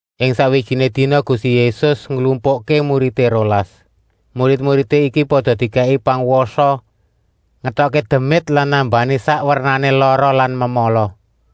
Ing sakwijiné dina Gusti Yésus nglumpukké muridé rolas. Murid-muridé iki pada dikèki pangwasa ngetokké demit lan nambani sak wernané lara lan memala.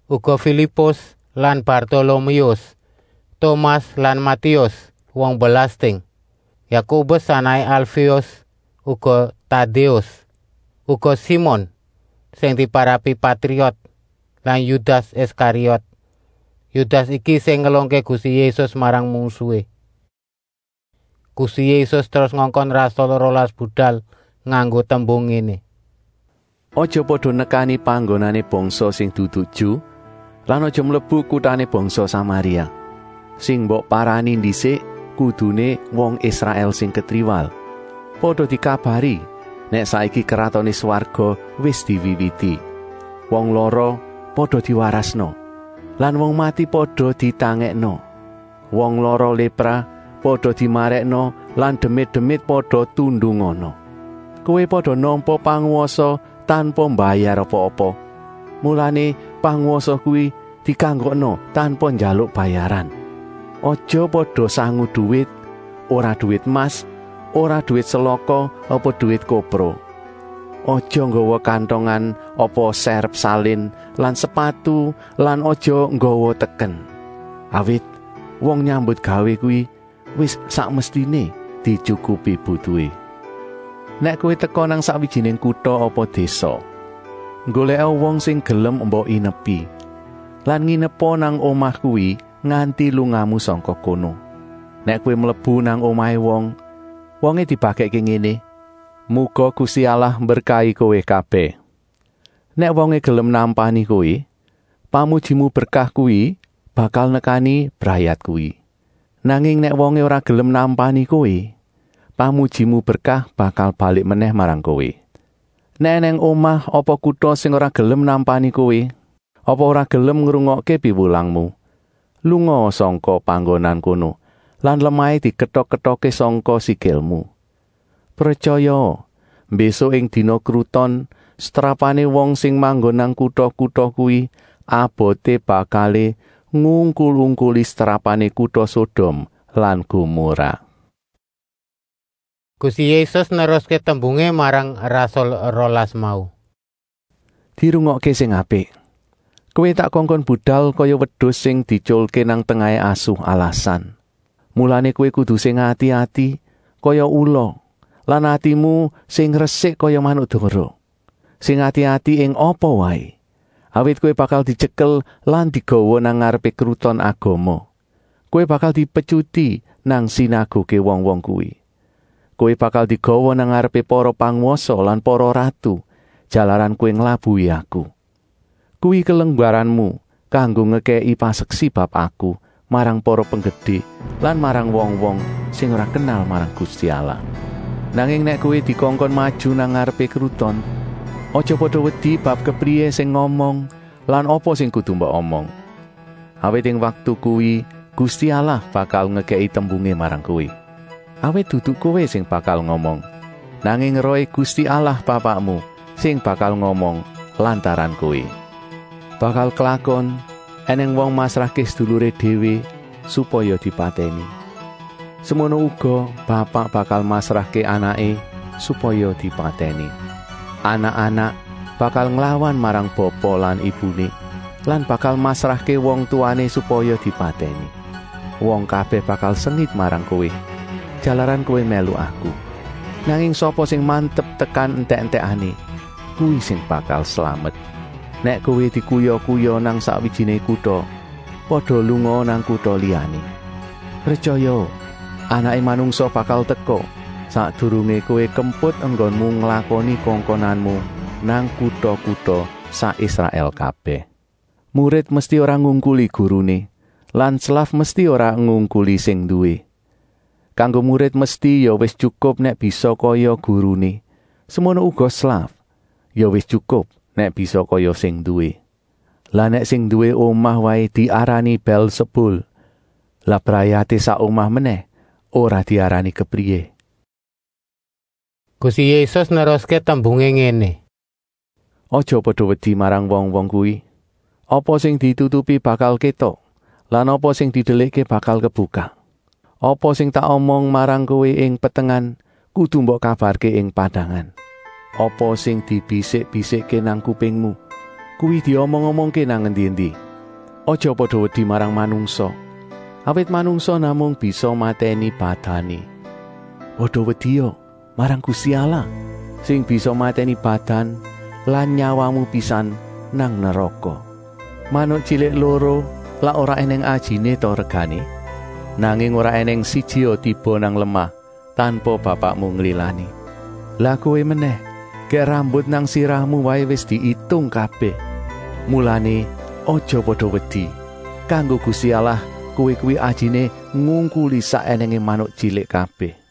Uga Filipus lan Bartoloméus, Tomas lan Matéus, wong belasting; Yakobus anaké Alféus, uga Tadéus. Uga Simon, sing diparapi Patriot lan Yudas Iskariot. Yudas iki sing ngelungké Gusti Yésus marang mungsuhé. Gusti Yésus terus ngongkon rasul rolas budal nganggo tembung ngéné: “Aja pada nekani panggonané bangsa sing dudu Ju lan aja mlebu kutané bangsa Samaria. Sing mbok parani ndisik kuduné wong Israèl sing ketriwal. Pada dikabari nèk saiki Kratoné Swarga wis diwiwiti. Wong lara pada diwarasna lan wong mati pada ditangèkna. Wong lara lépra pada dimarèkna lan demit-demit pada tundungana. Kowé pada nampa pangwasa tanpa mbayar apa-apa, mulané pangwasa kuwi dikanggokna tanpa njaluk bayaran. Aja pada sangu duwit, ora duwit emas, ora duwit selaka apa duwit kopro. Aja nggawa kantongan apa sèrep salin lan sepatu lan aja nggawa teken. Awit wong nyambutgawé kuwi wis sak mestiné dityukupi butuhé. “Nèk kowé teka nang sakwijiné kuta apa désa, nggolèka wong sing gelem mbok inepi lan nginepa nang omah kuwi nganti lungamu sangka kono. Nèk kowé mlebu nang omahé wong, wongé dibagèkké ngéné: ‘Muga Gusti Allah mberkahi kowé kabèh!’ Nèk wongé gelem nampani kowé, pamujimu berkah kuwi bakal nekani brayat kuwi. Nanging nèk wongé ora gelem nampani kowé, pamujimu berkah bakal balik menèh marang kowé. Nèk ènèng omah apa kuta sing ora gelem nampani kowé apa ora gelem ngrungokké piwulangmu, lungaa sangka panggonan kono lan lemahé diketok-ketokké sangka sikilmu. Pretyayaa, mbésuk ing dina kruton setrapané wong sing manggon nang kuta-kuta kuwi aboté bakalé ngungkul-ungkuli setrapané kuta Sodom lan Gomorah!” Gusti Yésus neruské tembungé marang rasul rolas mau: “Dirungokké sing apik! Kowé tak kongkon budal kaya wedus sing dietyulké nang tengahé asu alasan. Mulané kowé kudu sing ati-ati kaya ula lan atimu sing resik kaya manuk dara. Sing ati-ati ing apa waé, awit kowé bakal dityekel lan digawa nang ngarepé Kruton Agama. Kowé bakal dipetyuti nang sinaguké wong-wong kuwi. Kowé bakal digawa nang ngarepé para pangwasa lan para ratu, jalaran kowé nglabuhi Aku. Kuwi kelunggaranmu kanggo ngekèki paseksi bab Aku marang para penggedé lan marang wong-wong sing ora kenal marang Gusti Allah. Nanging nèk kowé dikongkon maju nang ngarepké kruton, aja pada wedi bab kepriyé sing ngomong lan apa sing kudu mbok omong. Awit ing waktu kuwi Gusti Allah bakal ngekèki tembungé marang kowé. Awit dudu kowé sing bakal ngomong, nanging Rohé Gusti Allah Bapakmu sing bakal ngomong lantaran kowé. “Bakal klakon ènèng wong masrahké seduluré déwé supaya dipatèni. Semono uga bapak bakal masrahké anaké supaya dipatèni. Anak-anak bakal nglawan marang bapa lan ibuné lan bakal masrahké wong tuwané supaya dipatèni. Wong kabèh bakal sengit marang kowé, jalaran kowé mèlu Aku. Nanging sapa sing mantep tekan entèk-entèkané, kuwi sing bakal slamet. Nèk kowé dikuya-kuya nang sakwijiné kuta, pada lungaa nang kuta liyané. Pretyayaa, Anaké Manungsa bakal teka, sakdurungé kowé kemput enggonmu nglakoni kongkonanmu nang kuta-kuta sak Israèl kabèh. “Murid mesti ora ngungkuli guruné lan slaf mesti ora ngungkuli sing nduwé. Kanggo murid mesti ya wis tyukup nèk bisa kaya guruné, semono uga slaf, ya wis tyukup nèk bisa kaya sing nduwé. Lah nèk sing nduwé omah waé diarani Bèlsebul, lah brayaté sak omah menèh ora diarani kepriyé!” Gusti Yésus neruské tembungé ngéné: “Aja pada wedi marang wong-wong kuwi. Apa sing ditutupi bakal kétok lan apa sing didelikké bakal kebukak. Apa sing tak omongké marang kowé ing petengan kudu mbok kabarké ing padangan. Apa sing dibisik-bisikké nang kupingmu, kuwi diomong-omongké nang endi-endi. Aja pada wedi marang manungsa, awit manungsa namung bisa matèni badané. Pada wedia marang Gusti Allah sing bisa matèni badan lan nyawamu pisan nang neraka. Manuk tyilik loro lak ora ènèng ajiné ta regané? Nanging ora ènèng sijia tiba nang lemah tanpa Bapakmu nglilani. Lah kowé menèh, gèk rambut nang sirahmu waé wis diitung kabèh. Mulané aja pada wedi. Kanggo Gusti Allah kowé kuwi ajiné ngungkuli sak ènèngé manuk tyilik kabèh.”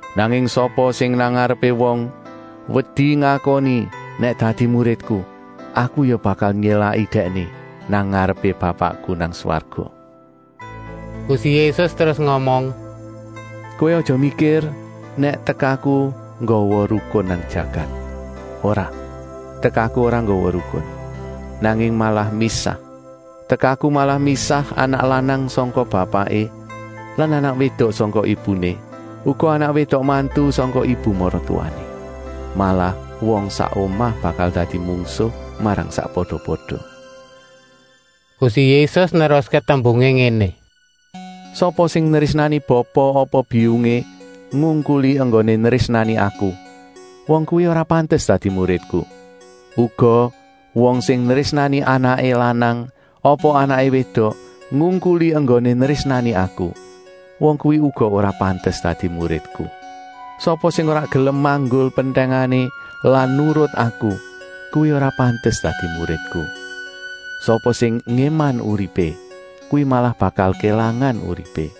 Nanging sapa sing wedi ngakoni nèk dadi muridku nang ngarepé wong, Aku ya bakal nyélaki dèkné nang ngarepé Bapakku nang swarga.” Gusti Yésus terus ngomong: “Kowé aja mikir nèk tekaku nggawa rukun nang jagat. Ora, tekaku ora nggawa rukun, nanging malah misah. Tekaku malah misah anak lanang sangka bapaké lan anak wédok sangka ibuné, uga anak wédok mantu sangka ibu maratuwané. Malah wong sak omah bakal dadi mungsuh marang sakpada-pada.” Gusti Yésus neruské tembungé ngéné: “Sapa sing nrésnani bapa apa biyungé ngungkuli enggoné nrésnani Aku, wong kuwi ora pantes dadi muridku. Uga wong sing nrésnani anaké lanang apa anaké wédok ngungkuli enggoné nrésnani Aku, wong kuwi uga ora pantes dadi muridku. Sapa sing ora gelem manggul pentèngané lan nurut Aku, kuwi ora pantes dadi muridku. Sapa sing ngéman uripé, kuwi malah bakal kélangan uripé.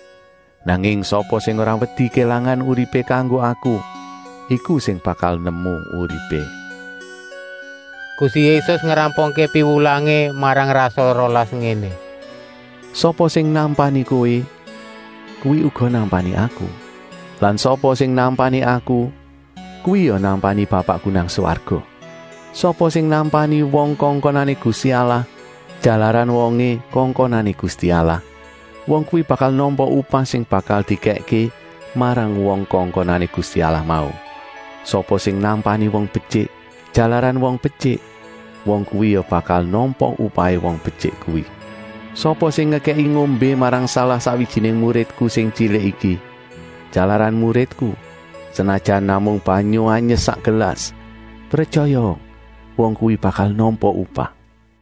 Nanging sapa sing ora wedi kélangan uripé kanggo Aku, iku sing bakal nemu uripé.” Gusti Yésus ngrampungké piwulangé marang rasul rolas ngéné: “Sapa sing nampani kowé, kuwi uga nampani Aku. Lan sapa sing nampani Aku, kuwi ya nampani Bapakku nang swarga. Sapa sing nampani wong kongkonané Gusti Allah, jalaran wongé kongkonané Gusti Allah, wong kuwi bakal nampa upah sing bakal dikèkké marang wong kongkonané Gusti Allah mau. Sapa sing nampani wong betyik, jalaran wong betyik, wong kuwi ya bakal nampa upahé wong betyik kuwi. Sapa sing ngekèki ngombé marang salah-sakwijiné muridku sing tyilik iki, jalaran muridku, senajan namung banyu anyes sak gelas, pretyayaa, wong kuwi bakal nampa upah.”